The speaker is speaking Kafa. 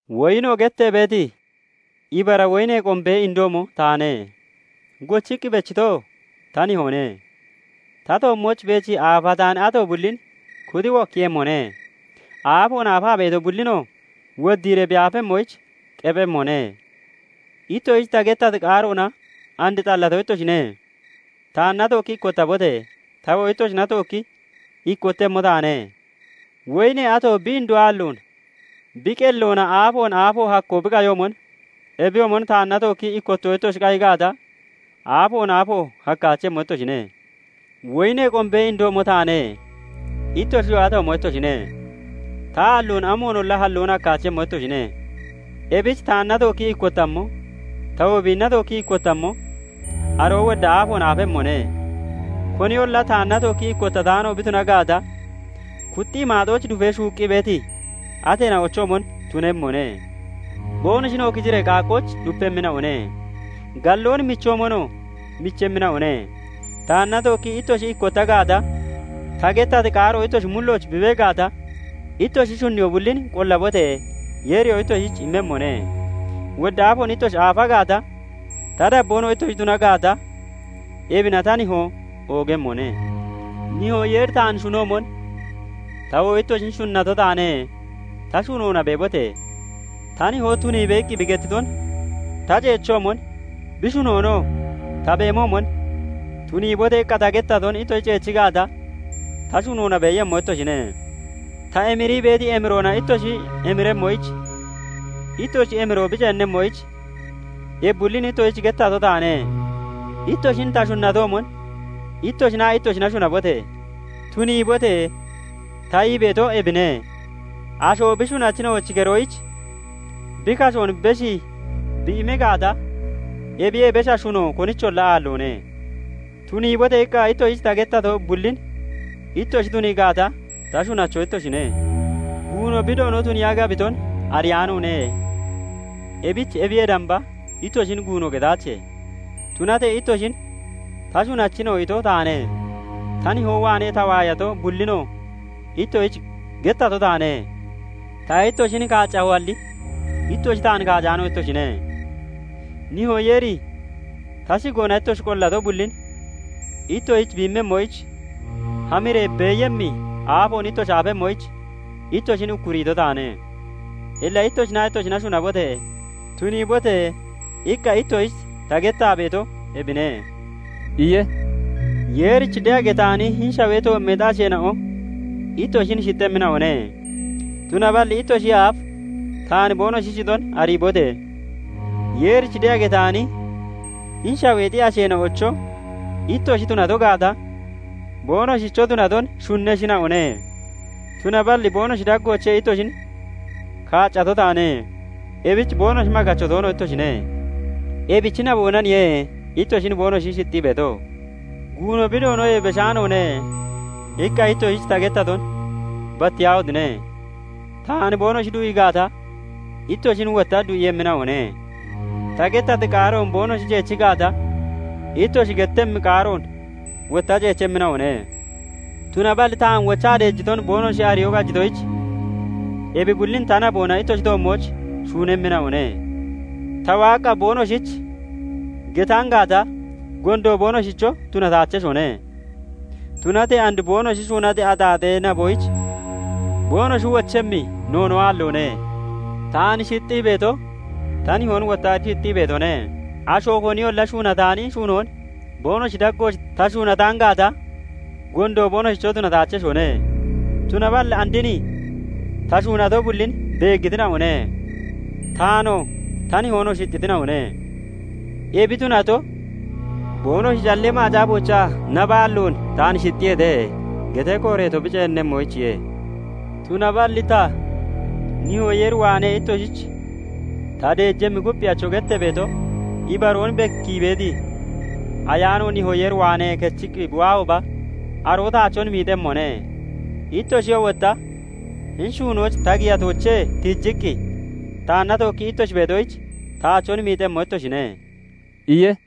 "Woyino gettee beeti ibara woyinee qombee indoomo taane; gochiqqi bechitoo ta Nihoone. Ta toommooch beechii aafataani ato bullin kuxi wokkiiyemmone; aafoon aafaa beeto bullinoo woddiiree bi aafemmoyich qephemmone. Ittoshich ta gettati qaaroona and xallato ittoshine. Taanna tookki ikkottabote! tawoo ittoshina tookki ikkottemmo taane. Woyinee ato bi indo aalloon bi qelloona aafoon aafo hakko bi qayoomon, ebiyoomon taanna tookkii ikkotto ittoshi qayi gaata, aafoon aafo hakkaachemmo ittoshine. "Woyinee qombee indoomo taane; ittoshiyoo atoomo ittoshine. Ta aalloon amoonolla halloon hakkaachemmo ittoshine. Ebich taanna tookkii ikkottammo, tawoo biinna tookkii ikkottammo, aroo wodda aafoon aafemmone. Koniyolla taanna tookkii ikkottataano bi tuna gaata, kuxxii maaxooch dufee shuuqqi beeti ateena'ochoomon tunemmone; boonoshinoo kiciree qaaqqooch dupemmina'one; galloon michoomonoo michemmina'one. Taanna tookkii ittoshi ikkotta gaata, ta gettati qaaroo ittoshi mullooch bi bee gaata, ittoshi shunniyoo bullin qollabote! Yeeriyoo ittoshich immemmone. Wodda aafoon ittoshi aafa gaata, ta dabboonoo ittoshi tuna gaata, ebina ta Nihoo oogemmone. "Nihoo Yeeri taan shunoomon ta wotta ittoshin shunnato taane; ta shunoona beebote! Ta Nihoo 'Tuniibe!' iqqi bi gettiton ta ceechoomon, bi shunoonoo ta beemoomon, 'Tuniibote!' iqqa ta gettaton ittoshi ceechi gaata, ta shunoona beeyemmo ittoshine. Ta emirii beeti emiroona ittoshi emiremmoyich, ittoshi emiroo bi ceennemmoyich, ebi bullin ittoshich gettato taane. Ittoshin ta shunnatoomon, ittoshinaa ittoshina shunabote! 'Tuniibote!' ta ii beeto ebine. Asho bi shunachina'ochi keroyich bi kashoon beshii bi immi gaata, ebiyee besha shuno konicholla aalloone. 'Tuniibote!' iqqa ittoshich ta gettato bullin ittoshi tunii gaata, ta shunacho ittoshine. Guuno bi doono tuniiya gabiton ariyaanoone; ebich ebiyee damba ittoshin guuno gataache. Tunatee ittoshin 'Ta shunachina'o' ito taane; ta nihoo waanee ta waayato bullinoo ittoshich gettato taane. Ta ittoshin kaaccahoalli ittoshi taan kaacaano ittoshine. Nihoo Yeeri ta shigoona ittoshi qollato bullin ittoshich bi immemmoyich, hamiree beeyemmi aafoon ittoshi aafemmoyich ittoshin ukkuriito taane. Illa ittoshinaa ittoshina shunabote! 'Tuniibote!' iqqa ittoshich ta gettaa beeto ebine" iye. Yeerich de'a getaani hini shawee toommeexi asheena'o ittoshin shixxemmina'one; tunaballi ittoshiyee aaf taan boonoshi shixon ariibote! Yeerich de'a getaani hini shaweexi asheena'ocho ittoshi tunato gaata, boonoshicho tunaton shunneshina'one; tunaballi boonoshi daggoochee ittoshin kaaccato taane; ebich boonoshi maggacho toono ittoshine; ebichi naboonaniye ittoshin boonoshi shixxii beeto. 'Guuno bi doonoyee beshaanoone' iqqa ittoshich ta gettaton battiyaahotine! Taan boonoshi du'ii gaata, ittoshin wotta du'iiyemmina'one. Ta gettati qaaroon boonoshi ceechi gaata, ittoshi gettemmi qaaroon wotta ceechemmina'one. Tunaballi taan wochaa deejiton boonoshi ariyoo qajitoyich, ebi bullin ta naboona ittoshi toommooch shuunemmina'one. Ta waaqqa boonoshich getaan gaata, gondo boonoshicho tunataacheshone; tunatee and boonoshi shuunati axaaxee naboyich boonoshi wochemmi noonoo aalloone. Taan shixxii beeto, ta Nihoon wotta shixxii beetone. Asho koniyolla shuunataani shuunoon boonoshi daggooch ta shuunataan gaata, gondo boonoshicho tunataacheshone; tunaballi and hini ta shuunato bullin beeggitina'one; taanoo ta Nihoonoo shixxitina'one. Ebi tunato, boonoshi callee Macaafoochaa 'Nabaalloon taan shixxiyeete' getee kooreeto bi ceennemmoyichiye. "Tunaballi ta, Nihoo Yeer waanee ittoshich ta deejemmi Kupphiyacho gettee beeto, ibaroon bekkii beeti Ayaano Nihoo Yeer waanee kechiqqi bi waahooba, aroo taachon miixemmone. Ittoshiyoo wotta hini shuunooch ta giyatoochee tiijiqqi taanna tookkii ittoshi beetoyich, taachon miixemmo ittoshine" iye.